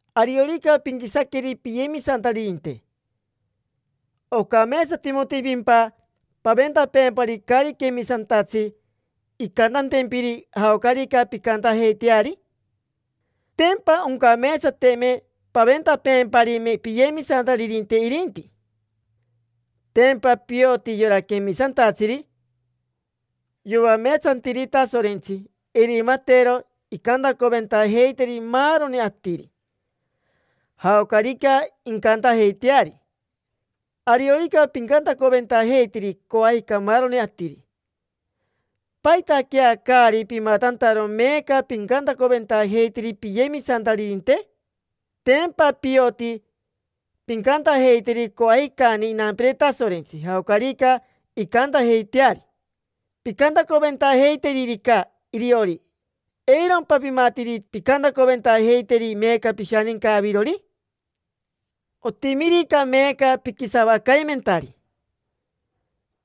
Ariorica pinquisaqueri piyemisantaririnte, ¿ocameetsatimotimpimpa paventapeempari caari quemisantatsi incantantempiri jaocarica pincantajeiteari? Tempa oncameetsateme paventapeemparime piyemisantaririnte irinti. Tempa pioti yora quemisantatsiri yoameetsantiri Tasorentsi irimatero incantacoventajeiteri maaroni atiri, jaocarica incantajeiteari. Ariorica pincantacoventajeiteri coajica maaroni atiri, ¿paitaquea caari pimatantaro meeca pincantacoventajeiteri piyemisantaririnte? Tempa pioti pincantajeiteri coajicani inampire Tasorentsi jaocarica incantajeiteari. Pincantacoventajeiteririca iriori, ¿eirompa pimatiri pincantacoventajeiteri meeca pishaninca avirori? Otimirica meeca piquisavacaimentari,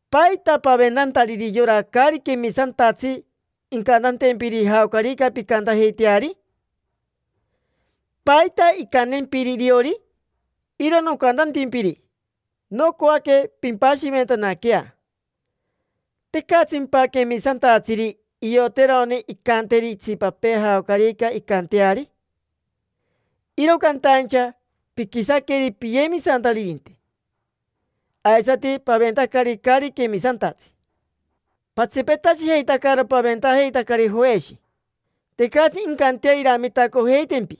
¿paita paventantariri yora caari quemisantatsi incantantempiri jaocarica pincantajeiteari? ¿Paita incantempiri iriori? Iro nocantantimpiri, nocoaque pimpashiventanaquea. ¿Tecatsimpa quemisantatsiri ioterone incanteri itsipapee jaocarica incanteari? Iro cantaincha piquisaqueri piyemisantaririnte, aisati paventacari caari quemisantatsi. Patsipetashijeitacaro paventajeitacari joeshi, tecatsi incantea iramitacojeitempi.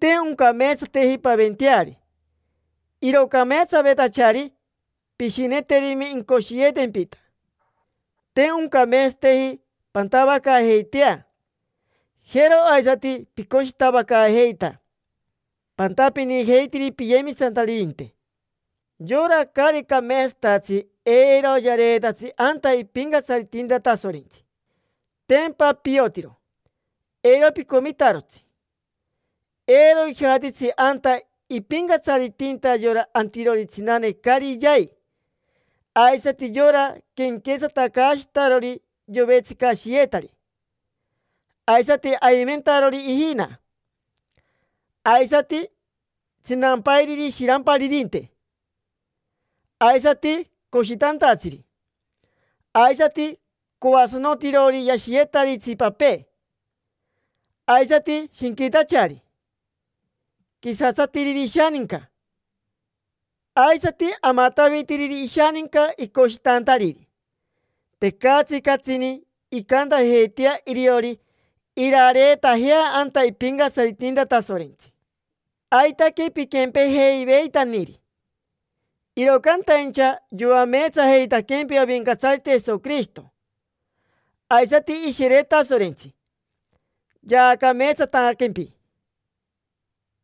Te oncameetsateji paventeari. Iro cameetsavetachari pishineteri incoshiyeetempita. Te oncameetsateji pantavacaajeitea. Jero aisati picoshitavacaajeita. Pantapinijeitiri piyemisantaririnte. Yora caari cameetsatatsi eiro yareetatsi anta ipincatsaritinta Tasorentsi. Tempa piotiro, eiro picomitarotsi. Eiro ijatitsi anta ipincatsaritinta yora antirori tsinane caari yai, aisati yora quenquetsatacaashitarori yovetsicashiyetari, aisati aimentarori ijina, aisati tsinampairiri ishiramparirinte, aisati coshitantatsiri, aisati coasanotirori yashiyetari itsipapee, aisati shinquitachari, quisatsatiriri ishaninca, aisati amatavitiriri ishaninca icoshitantariri. Tecatsi catsini incantajeitea iriori irareetajea anta ipincatsaritinta Tasorentsi. Aitaque piquempejeiveitaniri. Iro cantaincha yoameetsajeitaquempi Avincatsarite Jesoquirishito, aisati Ishire Tasorentsi: yaacameetsataquempi,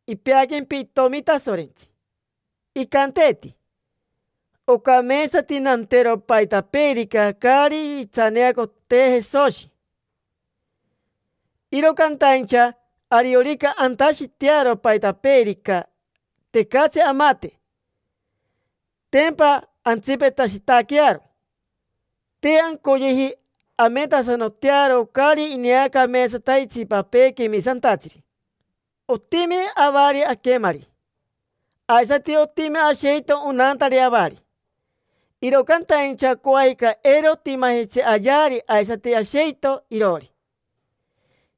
ipeaquempi itomi Tasorentsi. Icanteeti: “Ocameetsati nantero paitapeerica caari itsaneacotee Jesoshi”, iro cantaincha ariorica antashitearo paitapeerica, tecatsi amate: tempa antsipetashitaquearo. Te ancoyeji ametasanotearo caari ineacameetsata itsipapee quemisantatsiri. Otimi avari aquemari. Aisati otimi asheito onantari avari. Iro cantaincha coajica eiro otimajitsi ayeari aisati asheito iroori.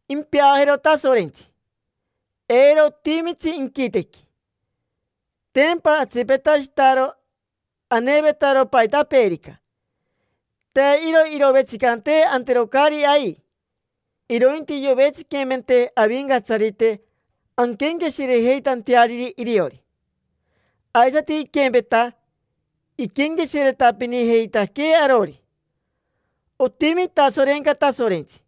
Impeajero Tasorentsi, eiro otimitsi inquitequi. Tempa atsipetashitaro anevetaro paitapeerica. Te iro irovetsicantee antero caari ai, irointi yovetsiquimentee Avincatsarite anquenqueshirejeitanteariri iriori. Aisati iquempeta, iquenqueshiretapinijeitaquee arori. Otimi itasorenca Tasorentsi,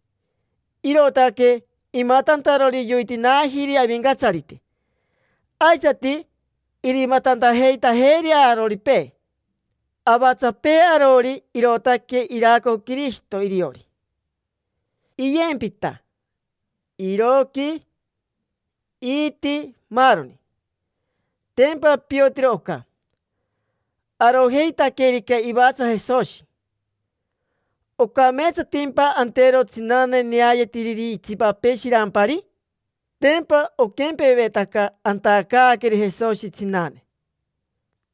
irootaque imatantarori yoitinaajiri Avincatsarite, aisati irimatantajeitajeeri aroripee. Avatsapee arori irootaque iraco Quirishito iriori: iyempita, iroqui, iiti, maaroni. Tempa piotiro oca. Arojeitaquerica ivatsa Jesoshi, ¿ocameetsatimpa antero tsinane neayetiriri itsipapee shirampari? Tempa oquempevetaca antacaaqueri Jesoshi tsinane.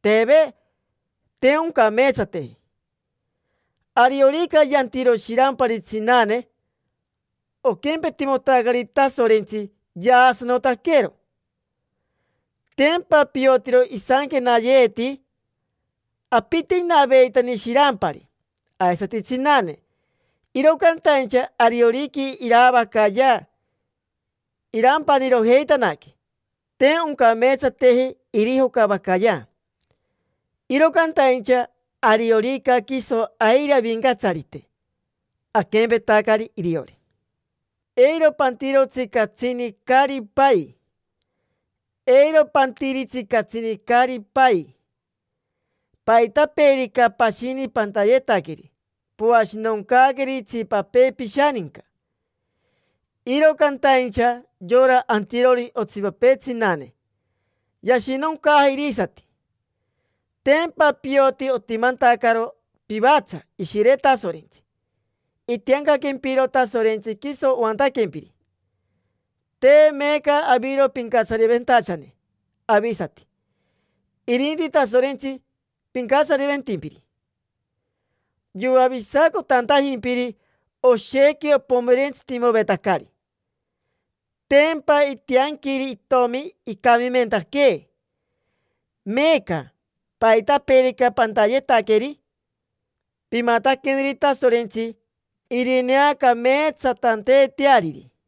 Teve, te oncameetsateji. Ariorica yantiro shirampari tsinane, oquempetimotacari Tasorentsi yaasanotaquero. Tempa piotiro. Isanquenayeeti: “Apite inaveitani shirampari aisati tsinane, iro cantaincha ariorica iraavacayea irampanirojeitanaque, te oncameetsateji irijocavacayea”. Iro cantaincha ariorica quiso airi Avincatsarite, aquempetacari iriori. Eiro pantirotsi catsini caari pai, eiro pantiritsi catsini caari pai. Paitapeerica pashini pantayetaqueri, poashinoncaaqueri itsipapee pishaninca; iro cantaincha yora antirori otsipapee tsinane, yashinoncaja irisati. Tempa pioti otimantacaro pivatsa Ishire Tasorentsi. Itiancaquempiro Tasorentsi quiso oantaquempiri. Te meeca aviro pincatsariventachane avisati, irinti Tasorentsi pincatsariventimpiri. Yoavisacotantajimpiri, oshequi opomerentsitimovetacari: tempa itianquiri itomi icamimentaquee. Meeca, paitapeerica pantayetaqueri, pimataqueneri Tasorentsi, irineacameetsatanteeteariri.